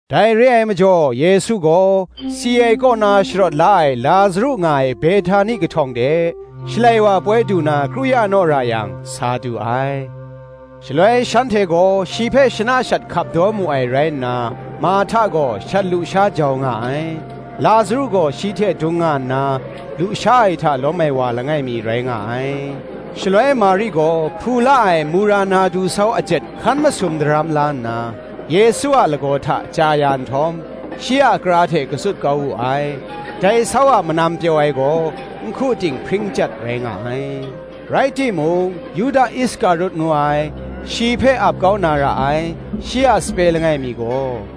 Dai re ai majaw Yesu gaw, si ai kaw na sharawt la ai Lazaru nga ai Behtani kahtawng de, Shalai wa ai poi du na kru ya naw ra yang, sa du ai. Shaloi shanhte gaw shi hpe shana shat hkap daw mu ai rai nna, Marhta gaw shat lusha jau nga ai: Lazaru gaw shi hte dung nga nna lusha ai hta lawm ai wa langai mi, rai nga ai. Shaloi Mari gaw hpu la ai mura nardu sau ajet hkan masum daram la nna, Yesu a lagaw hta chya ya nhtawm, shi a kara hte katsut kau wu ai: dai sau a manam pyaw ai gaw, nhku ting hpring chyat rai nga ai. Rai timung, Yuda Iskarut ngu ai, shi hpe ap kau na ra ai, shi a sape langai mi gaw,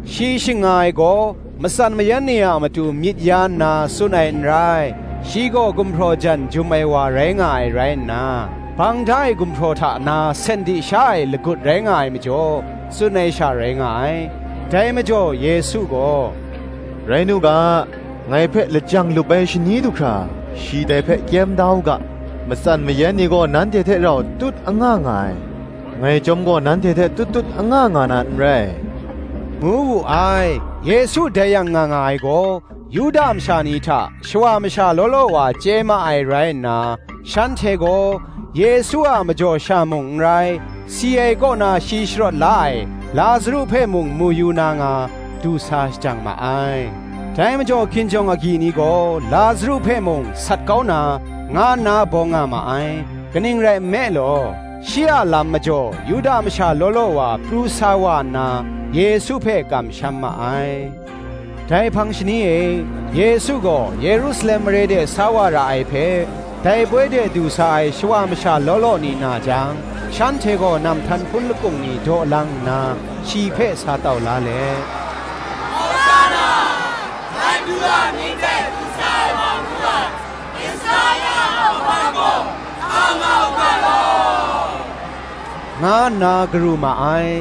Shi shing nga ai gaw, matsan mayan ni a matu myit ya nna tsun ai n rai: shi gaw gumhpraw jan jum ai wa rai nga ai rai nna, bang da ai gumhpraw hta na sen di sha ai lagut rai nga ai majaw, tsun ai sha rai nga ai. Dai majaw Yesu gaw, “Rai nu ga, ngai hpe lajang lup ai shani du hkra, shi dai hpe kyem da u ga: matsan mayan ni gaw nanhte hte rau tut anga nga ai, ngai chyawm gaw nanhte hte tut tut anga nga na n rai,” ngu wu ai. Yesu dai yang nga nga ai gaw, Yuda masha ni hta shawa masha law law wa chye ma ai rai nna, shanhte gaw Yesu a majaw sha mung n rai, si ai kaw na shi sharawt la ai Lazaru hpe mung mu yu na nga, du sa shajang ma ai. Dai majaw hkinjawng agyi ni gaw Lazaru hpe mung sat kau na, nga nna bawng nga ma ai: kaning rai nme law, shi a lam majaw Yuda masha law law wa pru sa wa nna, Yesu hpe kamsham ma ai. Dai hpang shani e Yesu gaw Yerusalem mare de sa wa ra ai hpe, dai poi de du sa ai shawa masha law law ni na jang, shanhte gaw namhtan hpun lakung ni daw lang nna shi hpe sa tau la let, “Hawsanna: Dai Madu a amying hte du sa ai wa ngu ai, Israela a hkawhkam gaw, a nga u ga law,” nga nna garu ma ai.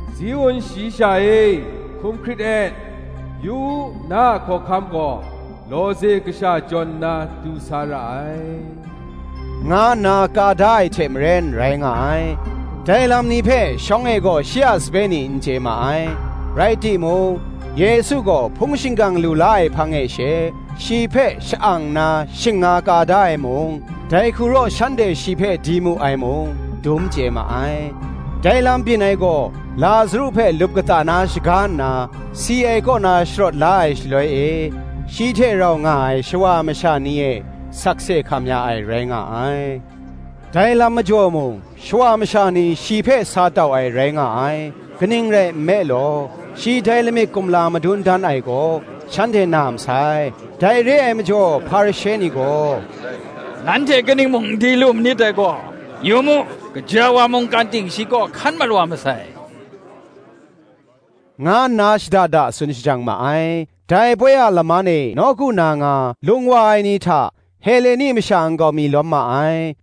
“Ziun shayi sha e, hkum hkrit et; Yu u, na a hkawhkam gaw Lawze kasha jawn nna du sa ra ai,” nga nna ka da ai hte maren rai nga ai. Dai lam ni hpe shawng e gaw shi a sape ni n chye ma ai: rai timung, Yesu gaw hpung shingkang lu la ai hpang e she, shi hpe sha-ang nna shing nga ka da ai mung, dai hku raw shanhte shi hpe di mu ai mung, dum chye ma ai. Dai lam byin ai gaw, Lazaru hpe lup kata na shaga nna, si ai kaw na sharawt la ai shaloi e, shi hte rau nga ai shawa masha ni e sakse hkam ya ai rai nga ai. Dai lam majaw mung, shawa masha ni shi hpe sa tau ai rai nga ai: kaning rai nme law, shi dai lamik kumla madun dan ai gaw, shanhte na masai. Dai re ai majaw Hparishe ni gaw, “Nanhte kaning mung n di lu manit dai gaw, yu mu; gaja wa mungkan ting shi kaw hkan mat wa masai,” nga nna shada da tsun shajang ma ai. Dai poi a laman e nawku na nga, lung wa ai ni hta Heleni masha nkau mi lawm ma ai.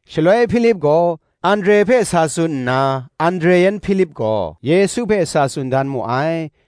Shaloi Hpilip gaw Andre hpe sa tsun nna, Andre yan Hpilip gaw Yesu hpe sa tsun dan mu ai.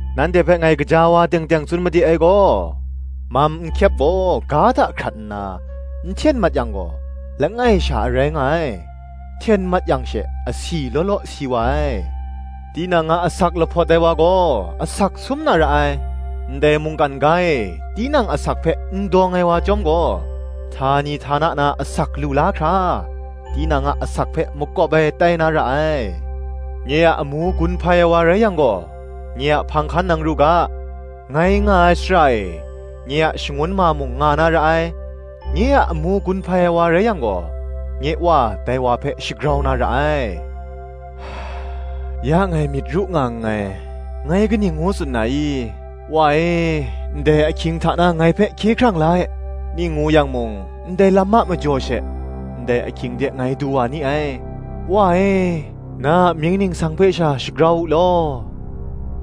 Nanhte hpe ngai gaja wa teng teng tsun made ai gaw, Mam nhkyep gaw ga hta hkrat nna, n hten mat yang gaw, langai sha a rai nga ai: hten mat yang she, asi law law si wa ai. Tinang a asak lahpawt ai wa gaw asak sum na ra ai: ndai mungkan ga e tinang asak hpe n dawng ai wa chyawm gaw, htani htana na asak lu la hkra, tinang a asak hpe makawp ai tai na ra ai. Nye a amu gun hpai ai wa rai yang gaw, nye a hpang hkan nang ru ga: ngai nga ai shara e, nye a shangun ma mung nga na ra ai; nye a amu gun hpai ai wa rai yang gaw, nye Wa dai wa hpe shagrau na ra ai. “Ya ngai myit ru nga nngai: ngai kaning ngu tsun na i? ‘Wa e, ndai ahkying hta na ngai hpe hkye hkrang la e:’ ning ngu yang mung ndai lam a majaw she, ndai ahkying de ngai du wa ni ai: Wa e, na a mying ningsang hpe sha shagrau u law,”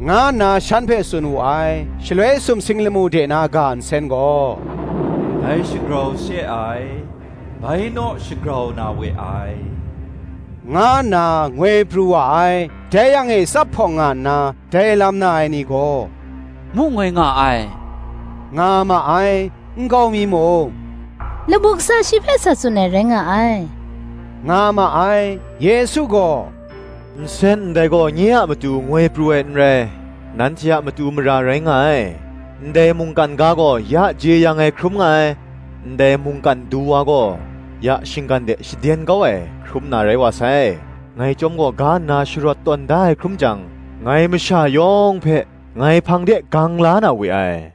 nga nna shan hpe tsun wu ai. Shaloi sumsing lamu de na ga nsen gaw, “Ngai shagrau se ai, bai naw shagrau na we ai,” nga nna, ngoi pru wa ai. Dai yang e tsap hpawng nga nna, dai lam na ai ni gaw, “Mu ngoi nga ai,” nga ma ai: nkau mi mung, “Lamu kasa shi hpe sa tsun ai rai nga ai,” nga ma ai. Yesu gaw, “Nsen ndai gaw nye a matu ngoi pru ai n rai, nanhte a matu mara rai nga ai. Ndai mungkan ga gaw, ya jeyang ai hkrum nga ai, ndai mungkan Du wa gaw, ya shinggan de shaden kau ai, hkrum na rai wa sai. Ngai chyawm gaw ga kaw nna sharawt tawn da ai hkrum jang, ngai masha yawng hpe, ngai hpang de gang la na we ai,”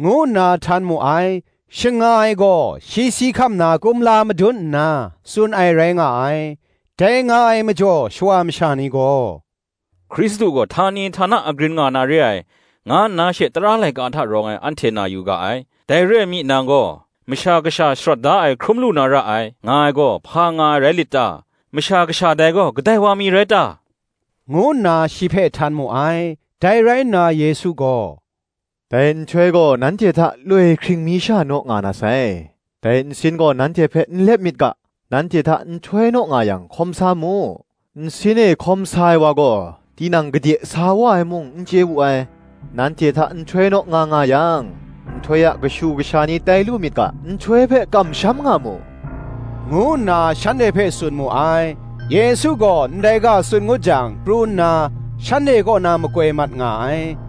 ngu nna htan mu ai. Shing nga ai gaw, shi si hkam na kumla madun nna, tsun ai rai nga ai. Dai nga ai majaw shawa masha ni gaw, “Hkristu gaw htani htana agrin nga na re ai, nga nna she tara laika hta rawng ai anhte na yu ga ai: dai re ai mi, nang gaw, Masha Kasha sharawt da ai hkrum lu na ra ai, nga ai gaw, hpa nga ai rai lit ta? Masha Kasha dai gaw, kadai wa mi rai ta?” ngu nna shi hpe htan mu ai. Dai rai nna Yesu gaw, “Dai nhtoi gaw nanhte hta loi hkring mi sha naw nga na sai: dai nsin gaw nanhte hpe n lep myit ga, nanhte hta nhtoi naw nga yang hkawm sa mu: nsin e hkawm sa ai wa gaw tinang gade sa wa ai mung, n chye wu ai. Nanhte hta nhtoi naw nga nga yang, nhtoi a kashu kasha ni tai lu myit ga, nhtoi hpe kamsham nga mu,” ngu nna shanhte hpe tsun mu ai. Yesu gaw ndai ga tsun ngut jang pru nna, shanhte kaw na makoi mat nga ai.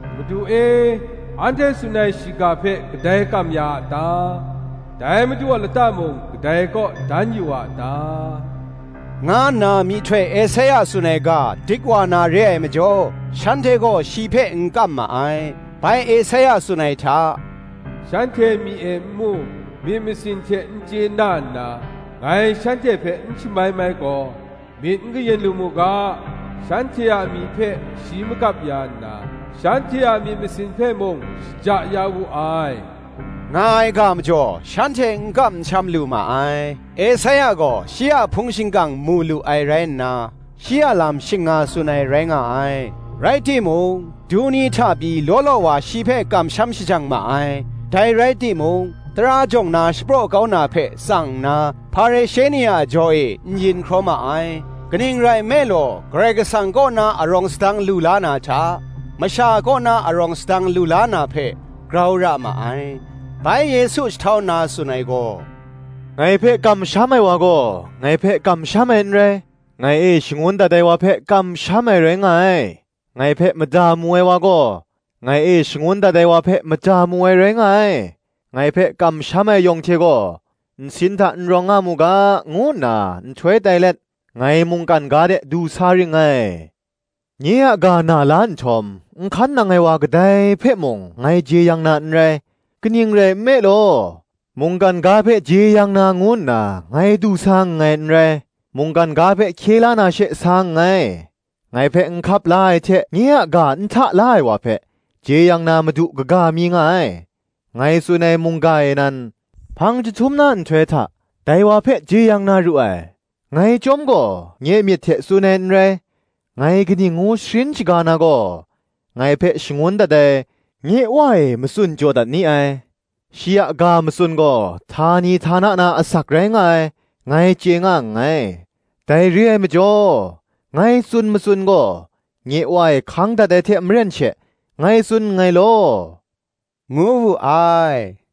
“Madu e, anhte tsun ai shiga hpe kadai kam ya a ta? Dai Madu a lata mung kadai kaw dan yu a ta?” nga nna myihtoi Esaia tsun ai ga dik wa na re ai majaw, shanhte gaw shi hpe n kam ma ai. Bai Esaia tsun ai hta, “Shanhte myi e n mu, myit masin hte n chye na nna, Ngai shanhte hpe n shamai mai gaw, Myit n kayin lu mu ga, Shanhte a myi hpe shi magap ya nna, Shanhte a myit masin hpe mung, shaja ya wu ai,” nga ai ga majaw, shanhte n kam n sham lu ma ai. Esaia gaw shi a hpung shingkang mu lu ai rai nna, shi a lam shing nga tsun ai rai nga ai. Rai timung, du ni hta pyi law law wa shi hpe kamsham shajang ma ai: dai rai timung, Tara jawng na shapraw kau na hpe tsang nna, Hparishe ni a jaw e n yin hkraw ma ai: kaning rai nme law, Karai Kasang kaw na arawng sadang lu la na hta, masha kaw na arawng sadang lu la na hpe, grau ra ma ai. Bai Yesu jahtau nna tsun ai gaw, “Ngai hpe kamsham ai wa gaw, ngai hpe kamsham ai n rai; ngai e shangun dat ai wa hpe kamsham ai rai nga ai. Ngai hpe mada mu ai wa gaw, ngai e shangun dat ai wa hpe mada mu ai rai nga ai. Ngai hpe kamsham ai yawng hte gaw, nsin hta n rawng nga mu ga, ngu nna nhtoi tai let, ngai mungkan ga de du sa ring ngai. Nye a ga na la nhtawm, n hkan nang ai wa kadai hpe mung ngai jeyang na n rai: kaning rai nme law, mungkan ga hpe jeyang na ngu nna, ngai du sa nngai n rai, mungkan ga hpe hkye la na she sa nngai. Ngai hpe n hkap la ai hte nye a ga n hta la ai wa hpe, jeyang na madu kaga mi nga ai: ngai tsun ai mungga e nan, hpang jahtum na nhtoi hta, dai wa hpe jeyang na ru ai. Ngai chyawm gaw nye myit hte tsun ai n rai; ngai kaning ngu sharin shaga na gaw, ngai hpe shangun dat ai, nye Wa e matsun jaw dat ni ai. Shi a ga matsun gaw htani htana na asak rai nga ai, ngai chye nga nngai: dai re ai majaw, ngai tsun matsun gaw, nye Wa e hkang dat ai hte maren she, ngai tsun nngai law,” ngu wu ai.